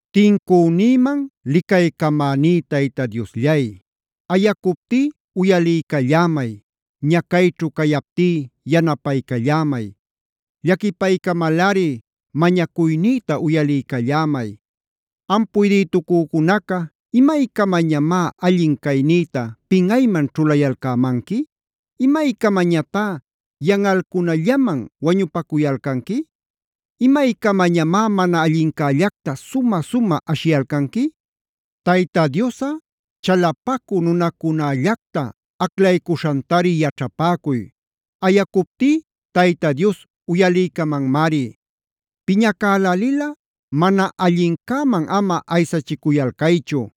Tincünïman licaycamäní Tayta Diosllay, ayacuptí uyaliycallämay, ñacayćhu cayaptí yanapaycallämay. Llaquipaycamalꞌari mañacuynïta uyaliycallämay. Am puydïtucücunaca ¿imaycamañamá allin caynïta pinꞌayman ćhulayalcämanqui? ¿Imaycamañatá yanꞌalcunallaman wañupacuyalcanqui? ¿Imaycamañamá mana allincällacta sumä-sumä ashiyalcanqui? Tayta Diosꞌa chalapacü nunacunällacta aclaycuśhantari yaćhapäcuy. Ayacuptí Tayta Dios uyaliycamanmari. Piñacälälilꞌa mana allincäman ama aysachicuyalcaychu.b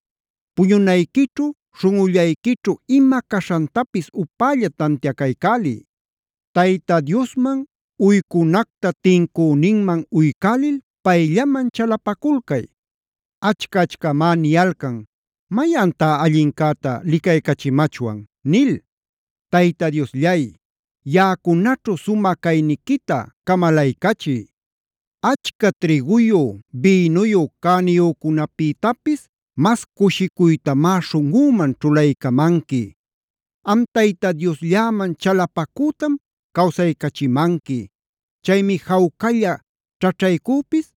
Puñunayquićhu śhunꞌullayquićhu ima caśhantapis upälla tantiacaycäliy. Tayta Diosman uycunacta tincüninman uycälil payllaman chalapaculcay. Achca-achcamá niyalcan: “¿Mayantá allincäta licaycachimachwan?” nil. Tayta Diosllay, yaꞌacunaćhu sumä cayniquita camalaycachiy. Achca trïguyu, bïnuyu cäniyücunäpïtapis mas cushicuytamá śhunꞌüman ćhulaycamanqui. Am Tayta Dioslläman chalapacütam cawsaycachimanqui. Chaymi jawcalla ćhaćhaycüpis,